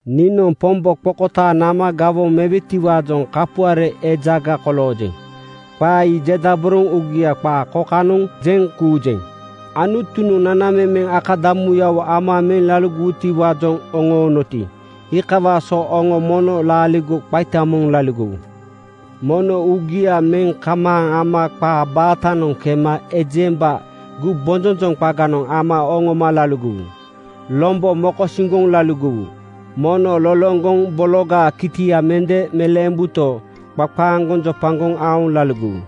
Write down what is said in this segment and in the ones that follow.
Niinoŋ Pombo qokotaaŋ nama gawoŋa mewetiwaajoŋ kapuare ejaga koloojeŋ. Qaa ii jedaboroŋ uugia qaa kokanoŋ jeŋ kuujeŋ: Anutunoŋ nanamemeŋ akadamuyawo ama meŋ laligowutiwaajoŋ oŋoonoti, iikawaa so oŋo mono laaligo qaita moŋ laligowu. Mono uugia meŋ kamaaŋ ama qaa baatanoŋ kema ejemba gumbonjonjoŋ qaganoŋ ama oŋoma laligowu. Lombo mokosiŋgoŋ laligowu. Mono loloŋgoŋ bologaa kitia mende meleembuto, qaqaaŋgoŋ jopagoŋ aoŋ laligowu.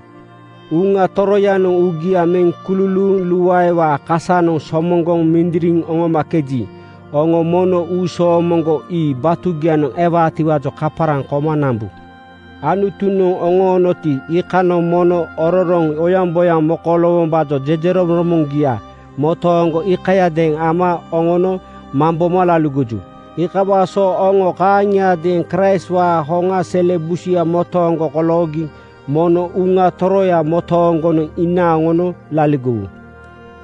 Uŋa Toroyanoŋ uugia meŋ kululuuŋ luaewaa kasanoŋ somoŋgoŋ mindiriŋ oŋomakeji, oŋo mono uusoomoŋgo ii batugianoŋ ewaatiwaajoŋ kaparaŋ koma nambu. Anutunoŋ oŋoonoti, iikanoŋ mono ororoŋ oyaŋboyaŋ koloowombaajoŋ jejeromoŋromoŋgia motooŋgo iikayadeeŋ ama oŋono mamboma laligoju. Iikawaa so oŋo kaaŋiadeeŋ Kraistwaa hoŋa sele busuya motooŋgo koloogi mono Uŋa Toroya motooŋgonoŋ inaaŋ oŋono laligowu.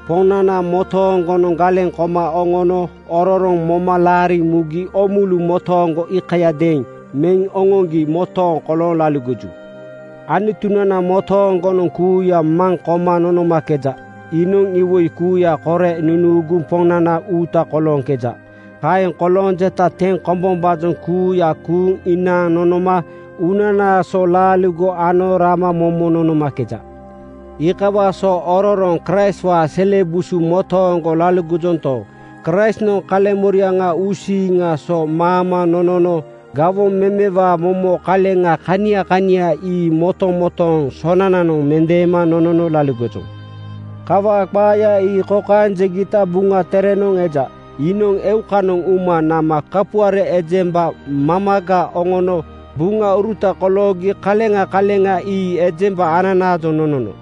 Poŋnana motooŋgonoŋ galeŋ koma oŋono ororoŋ moma laariŋ mugi oomulu motooŋgo iikayadeeŋ meŋ oŋoŋgi motooŋ kolooŋ laligoju. Anutunana motooŋgonoŋ kuuya maŋ koma nonomakeja. Iinoŋ iwoi kuuya kore nunuuguŋ Poŋnana uuta kolooŋkeja. Kaeŋ kolooŋ jeta teŋ kombombaajoŋ kuuya kuuŋ inaaŋ nonoma uunana so laaligo ano rama momo nonomakeja. Iikawaa so ororoŋ Kraistwaa sele busu motooŋgo laligojonto, Kraistnoŋ kaleŋmoriaŋa uusiiŋaa so maama nonono. Gawoŋ memewaa momo kaleŋa kania kania ii motomotooŋ sonananoŋ mendeema nonono laligojoŋ. Kawaa qaaya ii kokaeŋ jegita Buŋa Terenoŋ eja, “Iinoŋ eukanoŋ uma nama kapuare ejemba mamaga oŋono buŋauruta koloogi kaleŋa kaleŋa ii ejemba ananaajoŋ nonono.”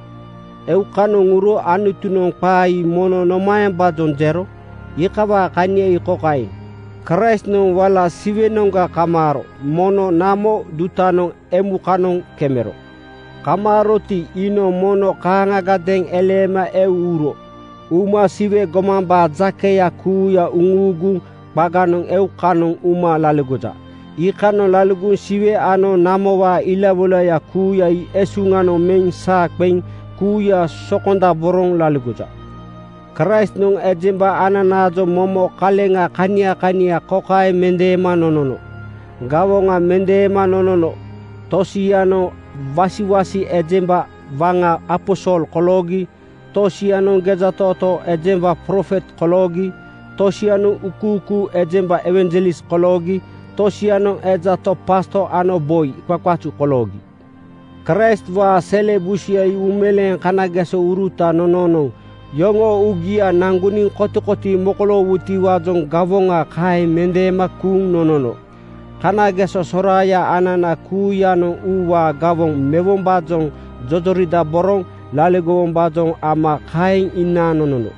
“Eukanoŋ uro,” Anutunoŋ qaa ii mono nomaembaajoŋ jero? Iikawaa kania ii kokaeŋ: Kraistnoŋ wala Siwenoŋga kamaaro. Mono namo dutanoŋ emukanoŋ kemero. Kamaaroti, iinoŋ mono kaaŋagadeeŋ eleema eu uro. Uma Siwe gomambaa jakeya kuuya uŋuuguŋ qaganoŋ eukanoŋ uma laligoja. Iikanoŋ laligoŋ Siwe ano namowaa ilawoilaya kuuya ii esuŋanoŋ meŋ saa qeŋ kuuya sokondaboroŋ laligoja. Kraistnoŋ ejemba ananaajoŋ momo kaleŋa kania kania kokaeŋ mendeema nonono: Gawoŋa mendeema nonono tosianoŋ wasiwasi ejemba waŋa (aposol) koloogi. Tosianoŋ gejatootoo ejemba (profet) koloogi. Tosianoŋ uukuukuu ejemba (ewanjelis) koloogi. Tosianoŋ eja to pasto ano boi qaqazu koloogi. Kraistwaa sele busuya ii uumeleeŋ kanagesouruta. Nononoŋ yoŋoo uugia naŋgoniŋ kotikotii mokoloowutiwaajoŋ gawoŋa kaeŋ mendeema kuuŋ nonono. Kanageso soraaya anana kuuyanoŋ uuwaa gawoŋ mewombaajoŋ jojoridaboroŋ laligowombaajoŋ ama kaeŋ inaaŋ nonono.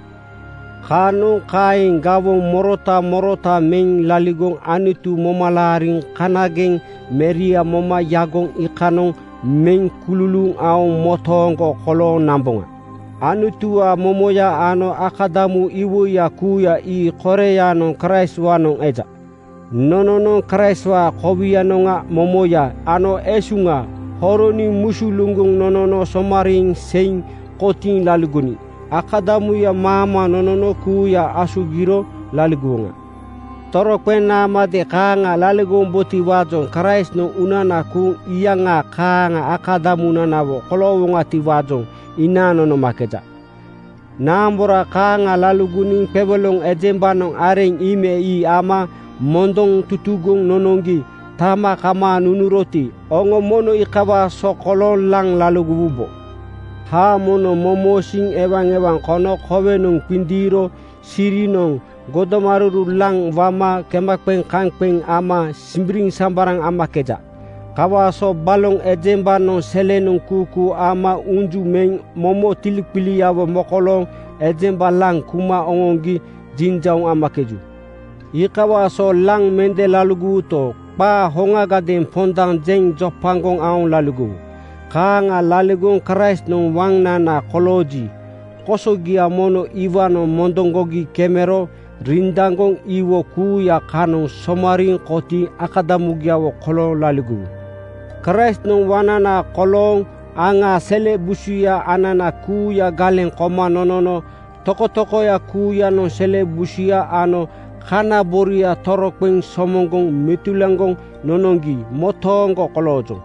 Kaanoŋ kaeŋ gawoŋ morota morota meŋ laligoŋ Anutu moma laariŋ kanageŋ Meria moma yagoŋ iikanoŋ meŋ kululuuŋ aoŋ motooŋgo kolooŋ namboŋa. Anutuwaa momoya ano akadamu iwoiya kuuya ii koreyanoŋ Kraistwaanoŋ eja. Nononoŋ Kraistwaa kowinoŋa momoya ano esuŋa horoniŋ musuluŋgoŋ nonono somariiŋ seiŋ kotiiŋ laligoniŋ akadamuya maama nonono kuuya asugiro laligowoŋa. Toroqeŋ naamade kaaŋa laligowombotiwaajoŋ Kraistnoŋ uunana kuuŋ iyaŋa kaaŋa akadamunanawo koloowoŋatiwaajoŋ inaaŋ nonomakeja. Naambora kaaŋa laligoniŋ qewoloŋ ejembanoŋ areŋ ii me ii ama mondoŋ tutugoŋ nonoŋgi tama kamaaŋ nunuroti, oŋo mono iikawaa so kolooŋ laŋ laligowubo. Haamonoŋ momosiiŋ ewaewaŋ kono kowenoŋ qindiiro sirinoŋ godomaruru laŋ wama kemaqeŋ-kaŋqeŋ ama simbiriŋsambaraŋ amakeja. Kawaa so baloŋ ejembanoŋ selenoŋ kuukuu ama unju meŋ momo tiliqiliawo mokolooŋ ejemba laŋ kuma oŋoŋgi jinjauŋ amakeju. Iikawaa so laŋ mende laligowuto, qaa hoŋagadeeŋ pondaŋ jeŋ jopagoŋ aoŋ laligowu. Kaaŋa laligoŋ Kraistnoŋ waŋnana kolooji, kosogia mono iwaanoŋ mondoŋgogi kemero rindaŋgoŋ iwoi kuuya kanoŋ somariiŋ kotiiŋ akadamugiawo kolooŋ laligowu. Kraistnoŋ waŋnana kolooŋ aŋaa sele busuya anana kuuya galeŋ koma nonono tokotokoya kuuyanoŋ sele busuya ano kana boria toroqeŋ somoŋgoŋ metulaŋgoŋ nonoŋgi motooŋ koloojoŋ.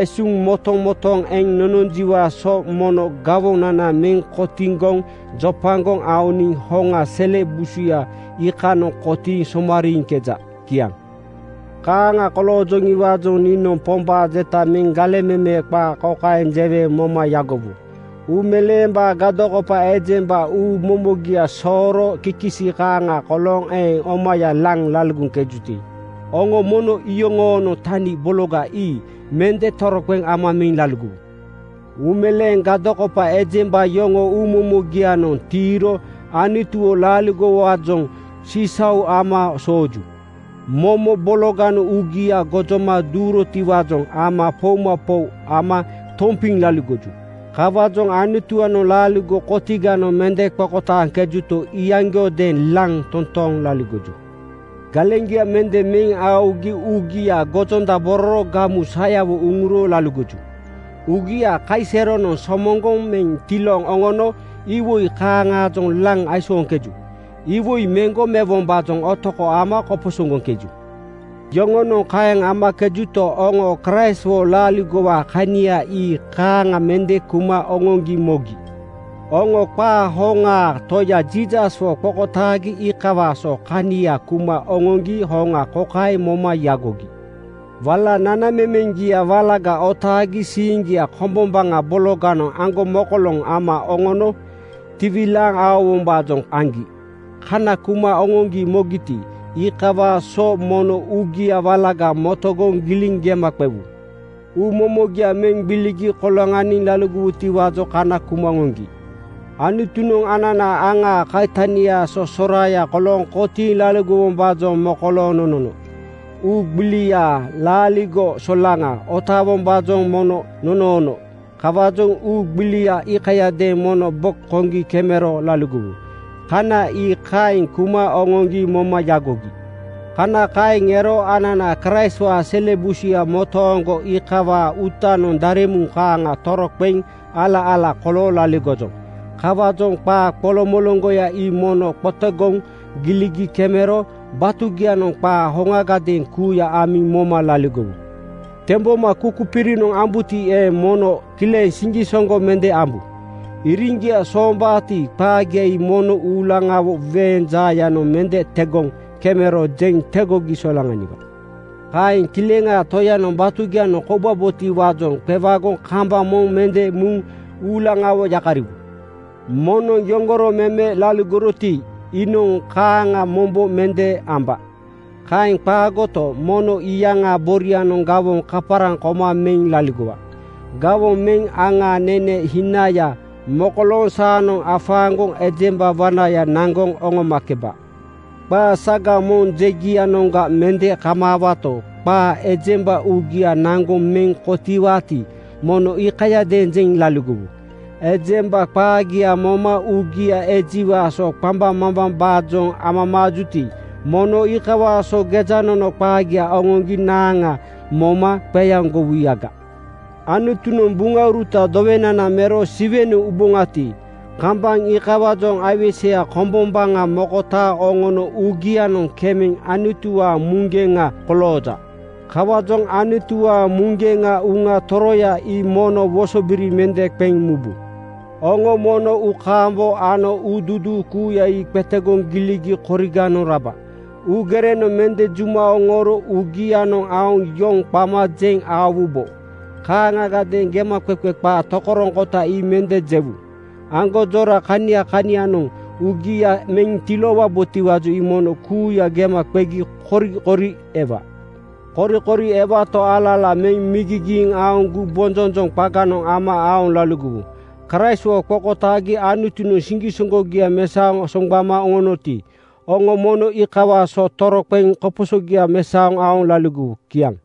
Esuŋ motomotooŋ eŋ nononjiwaa so mono gawonana meŋ kotiŋgoŋ jopagoŋ aoniŋ hoŋa sele busuya iikanoŋ kotiiŋ somariiŋkeja. Kiaŋ. Kaaŋa koloojoŋiwaajoŋ niinoŋ Pombaa jeta meŋ galeŋ meme qaa kokaeŋ jewe moma yagowu: Uumeleembaa gadokopa ejemba uumomogia sooro kikisi kaaŋa kolooŋ eeŋ omaya laŋ laligoŋkejuti, oŋo mono iyoŋoonoŋ tani bologa ii mende toroqeŋ ama meŋ laligowu. Uumeleembaa gadokopa ejemba yoŋoo uumomogia-noŋ tiiro Anutuwo laaligowaajoŋ sisau ama sooju. Momo bologanoŋ uugia gojoma duurotiwaajoŋ ama poumapou ama tompiŋ laligoju. Kawaajoŋ Anutuwaanoŋ laaligo kotiganoŋ mende qokotaaŋkejuto, iyaŋgiodeeŋ laŋ toontooŋ laligoju. Galeŋgia mende meŋ aogi uugia gojondabororo gamu sayawo uŋuro laligoju. Uugia kaiseronoŋ somoŋgoŋ meŋ tilooŋ oŋono iwoi kaaŋaajoŋ laŋ aisooŋkeju. Iwoi meŋgo mewombaajoŋ otoko ama koposoŋgoŋkeju. Yoŋonoŋ kaeŋ amakejuto, oŋo Kraistwo laaligowaa kania ii kaaŋa mende kuma oŋoŋgi mogi. Oŋo qaa hoŋaa Toya Jiisaswo qokotaagi iikawaa so kania kuma oŋoŋgi hoŋa kokaeŋ moma yagogi: Wala nanamemeŋgia walaga otaagi siiŋgia kombombaŋa bologanoŋ aŋgomokoloŋ ama oŋono tiwilaaŋ aowombaajoŋ aŋgi. Kana kuma oŋoŋgi mogiti, iikawaa so mono uugia walaga motogoŋ giliŋ gema qewu. Uumomogia meŋ gbiligi koloŋaniŋ laligowutiwaajoŋ kana kuma oŋoŋgi. Anutunoŋ anana aŋaa kaitaniaa so soraaya kolooŋ kotiiŋ laligowombaajoŋ mokolooŋ nonono. Uu gbiliaa laaligo solaŋa otaawombaajoŋ mono nonoono. Kawaajoŋ uu gbilia iikayadeeŋ mono bo koŋgi kemero laligowu. Kana ii kaeŋ kuma oŋoŋgi moma yagogi. Kana kaeŋ ero anana Kraistwaa sele busuya motooŋgo iikawaa uutanoŋ daremuŋ kaaŋa toroqeŋ ala-ala kolooŋ laligojoŋ. Kawaajoŋ qaa qoloŋmoloŋgoya ii mono motogoŋ giligi kemero batugianoŋ qaa hoŋagadeeŋ kuuya amiŋ moma laligowu. Temboma kukupirinoŋ ambuti eeŋ, mono kileŋ siŋgisoŋgo mende ambu. Iriŋgia soombaati, qaagia ii mono uulaŋawo weeŋ jaayanoŋ mende tegoŋ kemero jeŋ tegogi solaŋaniwa. Kaeŋ Kileŋaa Toyanoŋ batugianoŋ koubabotiwaajoŋ qewagoŋ kambaŋ moŋ mende muŋ uulaŋawo yakariwu. Moŋnoŋ yoŋgoro meme laligoroti, iinoŋ kaaŋa mombo mende amba. Kaeŋ qaagoto, mono iyaŋaa borianoŋ gawoŋ kaparaŋ koma meŋ laligowa. Gawoŋ meŋ aŋaa nene hinaya mokolooŋ saanoŋ afaaŋgoŋ ejemba wanaya naŋgoŋ oŋomakeba. Qaa saga moŋ jegianoŋga mende kamaawato, qaa ejemba uugia naŋgoŋ meŋ kotiiwaati, mono iikayadeeŋ jeŋ laligowu. Ejemba qaagia moma uugia ejiwaa so qambaŋmambambaajoŋ amamaajuti, mono iikawaa so gejanono qaagia oŋoŋgi naaŋa moma qeaŋgowuyaga. Anutunoŋ buŋauruta dowenana mero Siwenoŋ uboŋati, kambaŋ iikawaajoŋ aiweseya kombombaŋa mokotaaŋ oŋono uugianoŋ kemeŋ Anutuwaa muŋgeŋa kolooja. Kawaajoŋ Anutuwaa muŋgeŋa Uŋa Toroya ii mono wosobiri mende qeŋ mubu. Oŋo mono uukaambo ano uuduuduu kuuya ii qetegoŋ giligi koriganoŋ raba. Uugerenoŋ mende juma oŋooro uugianoŋ aoŋ yoŋ qama jeŋ aowubo. Kaaŋagadeeŋ gemaqeqe qaa tokoroŋkota ii mende jewu. Aŋgonjora kania kanianoŋ uugia meŋ tiloowabotiwaajoŋ ii mono kuuya gema qegi korikori ewa. Korikori ewato, ala-ala meŋ migigiiŋ aoŋ gumbonjonjoŋ qaganoŋ ama aoŋ laligowu. Kraistwo qokotaagi Anutunoŋ siŋgisoŋgogia mesaoŋ soŋgbama oŋonoti, oŋo mono iikawaa so toroqeŋ koposogia mesaoŋ aoŋ laligowu. Kiaŋ.